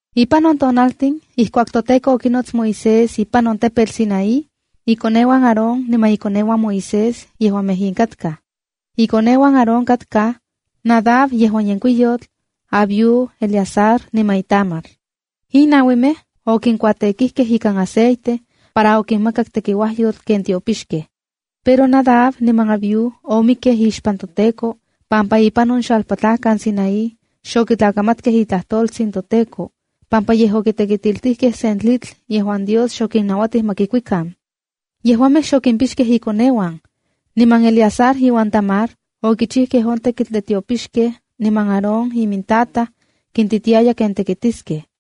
Ipan on tonaltin ijkuak toTEKO okinots Moisés ipan on tepetl Sinaí, ikoneuan Aarón niman ikoneuan Moisés yejuamej in katkaj: Ikoneuan Aarón katkaj: Nadab yejuan yenkuiyotl, Abiú, Eleazar, niman Itamar. In nauimej okinkuatekijkej ikan aceite para okinmakak tekiuajyotl ken tiopixkej. Pero Nadab niman Abiú omikkej ixpan toTEKO pampa ipan on xalpatlajkan Sinaí xokitlakamatkej itlajtoltsin toTEKO pampa yej okitekitiltijkej sen tlitl yejuan Dios xokinnauatij ma kikuikan. Yejuamej xokipixkej inkoneuan. Niman Eleazar iuan Itamar okichijkej on tekitl de tiopixkej niman Aarón imintataj kintitiaya ken tekitiskej.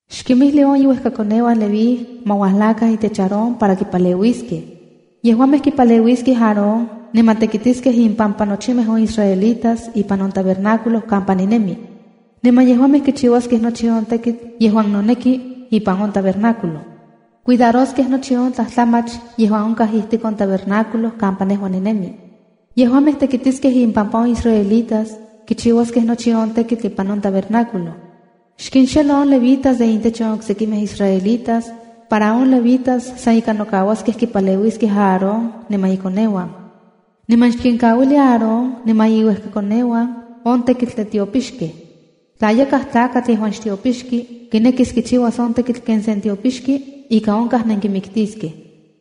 “Xkimijli on iuejkakoneuan Leví ma uajlakan itech Aarón para kipaleuiskej. Yejuamej kipaleuiskej Aarón niman tekitiskej impampa nochimej on israelitas ipan on tabernáculo kampa ninemi. Niman yejuamej kichiuaskej nochi on tekitl yejuan noneki ipan on tabernáculo. Cuidaroskej nochi on tlajtlamach yejuan onkaj ijtik on tabernáculo kampa nejua ninemi. Yejuamej tekitiskej impampa on israelitas, kichiuaskej nochi on tekitl ipan on tabernáculo. Xkinxelo on levitas de intech on oksekimej israelitas para on levitas san ika nokauaskej kipaleuiskej Aarón, niman ikoneuan. Niman xkinkauili Aarón niman iuejkakoneuana on tekitl de tiopixkej. Tla yakaj tlakatl yejuan xtiopixki kinekis kichiuas on tekitl ken sen tiopixki, ika onkaj nenkimiktiskej.”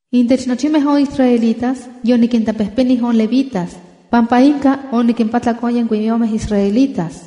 “Intech nochimej on israelitas yonikintlapejpenij on levitas, pampa inka onikimpatlak on yenkuiyomej israelitas.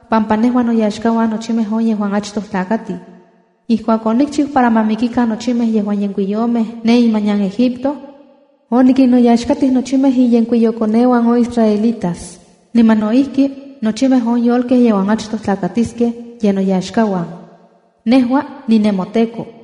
pampa nejua noyaxkauan nochimej on yejuan achtoj tlakatij. Ijkuak onikchiu para ma mikikan nochimej yejuan yenkuiyomej ne imanian Egipto, onikinnoyaxkatij nochimej inyenkuiyokoneuan on israelitas, niman no ijki nochimej on yolkej yejuan achtoj tlakatiskej, ye noyaxkauan. Nejua ninemoTEKO.”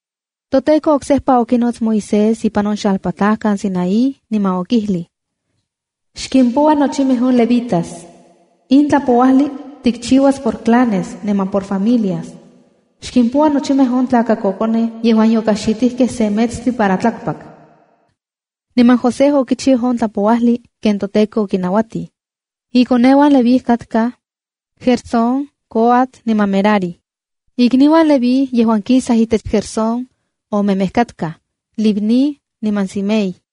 ToTEKO oksejpa okinots Moisés ipan on xalpatlajkan Sinaí, niman okijlij: “Xkimpoua nochimej on levitas. In tlajpouajli tikchiuas por clanes niman por familias. Xkimpoua nochimej on tlakakokonej yejuan yokaxitijkej se metstli para tlakpak.” Niman Moisés okichiu on tlajpouajli ken toTEKO okinauatij. Ikoneuan Leví katkaj: Gersón, Coat niman Merari. Ixuiuan Leví yejuan kisaj itech Gersón, omemej katkaj: Libni niman Simei.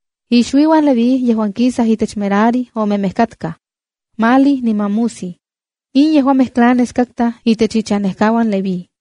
Ixuiuan Leví yejuan kisaj itech Merari omemej katkaj: Mahli niman Musi. In yejuamej clanes katkaj itech inchanejkauan Leví.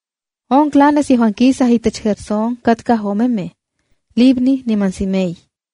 On clanes yejuan kisaj itech Gersón katkaj omemej, Libni niman Simei.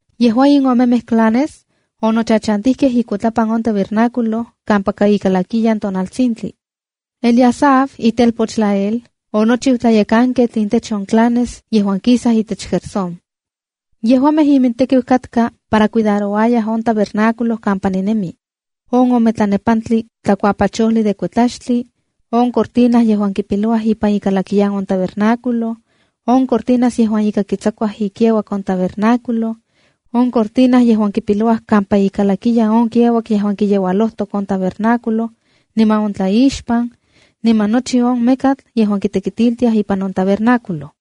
Yejua in omemej clanes onochachantijkej ikuitlapan on tabernáculo kampaka ikalakiyan tonaltsintli. Eliasaf, itelpoch Lael, onochiu tlayekanketl intech on clanes yejuan kisaj itech Gersón. Yejuamej imintekiu katka para cuidarouayaj on tabernáculo kampa ninemi, on ome tlanepantli tlakuapachojli de kuetlaxtli, on cortina yejuan kipilouaj ipan ikalakiyan on tabernáculo, on cortinas yejuan ika kitsakuaj ikiauak on tabernáculo, on cortina yejuan kipilouaj kampa ikalakiyan on kiauak yejuan kiyeualojtok on tabernáculo niman on tlaixpan, niman nochi mekatl yejuan kitekitiltiaj ipan on tabernáculo.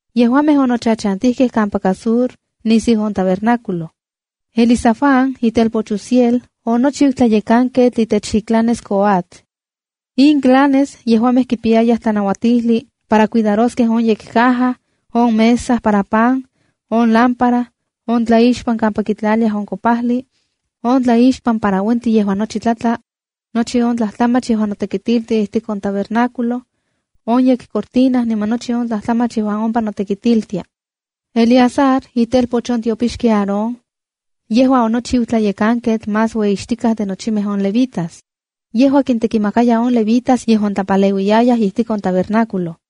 Yejuamej onochachantijkej kampaka Sur nisiu on tabernáculo. Elizafán, itelpoch Uziel, onochiu tlayekanketl itech iclanes Coat. In clanes yejuamej kipiyayaj tlanauatijli para cuidaroskej on yekcaja, on mesa para pan, on lámpara, on tlaixpan kampa kitlaliayaj para kopajli, on tlaixpan para uentli yejuan nochi tlatla, nochi on tlajtlamach yejuan notekitiltia ijtik on tabernáculo, on yekcortina niman nochi on tlajtlamach yejuan ompa notekitiltia. Eleazar, itelpoch on tiopixki Aarón, yejua onochiu tlayekanketl más ueyixtikatka de nochimej on levitas. Yejua kintekimakaya on levitas yejuan tlapaleuiyayaj ijtik on tabernáculo.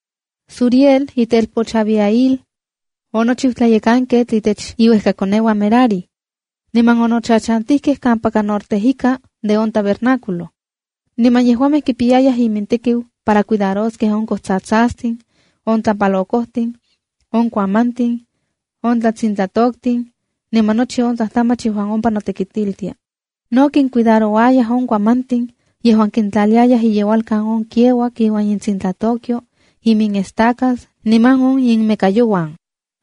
Zuriel itelpoch Abihail, onochiu tlayekanketl itech iuejkakoneuan Merari, niman onochachantijkej kampaka Norte ika de on tabernáculo. Niman yejuamej kipiyayaj imintekiu para cuidaroskej on kojtsatsastin, on tlapalokojtin, on kuamantin, on tsintlatoktin, niman nochi on tlajtlamach yejuan ompa notekitiltia. No kincuidarouayaj on kuamantin yejuan kintlaliayaj iyeualkan on kiauak iuan intsintlatokyo, iminestacas niman on iminmekayouan.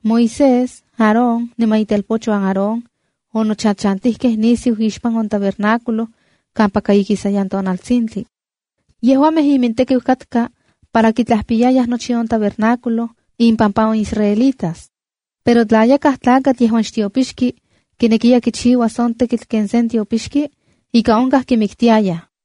Moisés, Aarón niman itelpochuan Aarón onochachantijkej nisiu ixpan on tabernáculo kampaka ikisayan tonaltsintli. Yejuamej imintekiu katka para kitlajpiyayaj nochi on tabernáculo impampa on israelitas. Pero tla yakaj tlakatl yejuan xtiopixki kinekiya kichiuas on tekitl ken sen tiopixki, ika onkaj kimiktiayaj.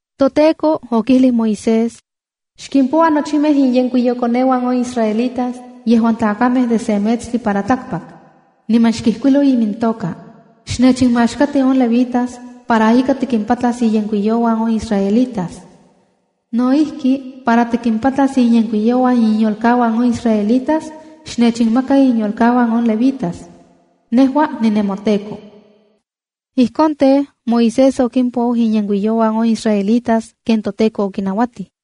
ToTEKO okijlij Moisés: “Xkimpoua nochimej inyenkuiyokoneuan on israelitas yejuan tlakamej de se metstli para tlakpak, niman xkijkuilo imintoka. Xnechinmaxkati on levitas para ika tikimpatlas inyenkuiyokoneuan on israelitas. No ijki, para tikimpatlas inyenkuiyokoneuan inyolkauan on israelitas, xnechinmaka inyolkauan on levitas. Nejua ninemoTEKO.” Ijkon tej, Moisés okimpou inyenkuiyokoneuan on israelitas ken toTEKO okinauatij.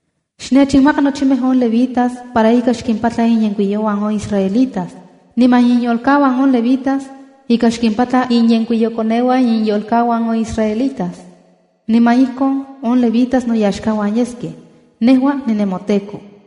“Xnechinmaka nochimej on levitas para ika xkimpatla inyenkuiyokoneuan on israelitas, niman inyolkauan on levitas ika xkimpatla inyenkuiyokoneuan inyolkauan on israelitas, niman ijkon on levitas noyaxkauan yeskej. Nejua ninemoTEKO.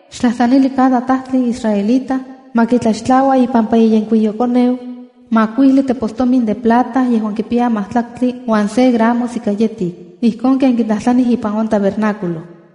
xtlajtlanili cada tajtli israelita ma kitlaxtlaua ipampa iyenkuiyokoneu makuijli tepostomin de plata yejuan kipiya majtlaktli uan se gramos ika yetik, ijkon ken kitlajtlanij ipan on tabernáculo.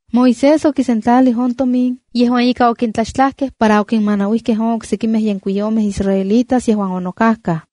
Moisés okisentlalij on tomin yejuan ika okintlaxtlajkej para oquinmanauijkej on oksekimej yenkuiyomej israelitas yejuan onokajkaj.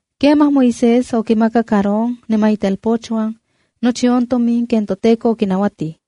Kemaj Moisés okimakak Aarón niman itelpochuan nochi on tomin ken toTEKO okinauatij.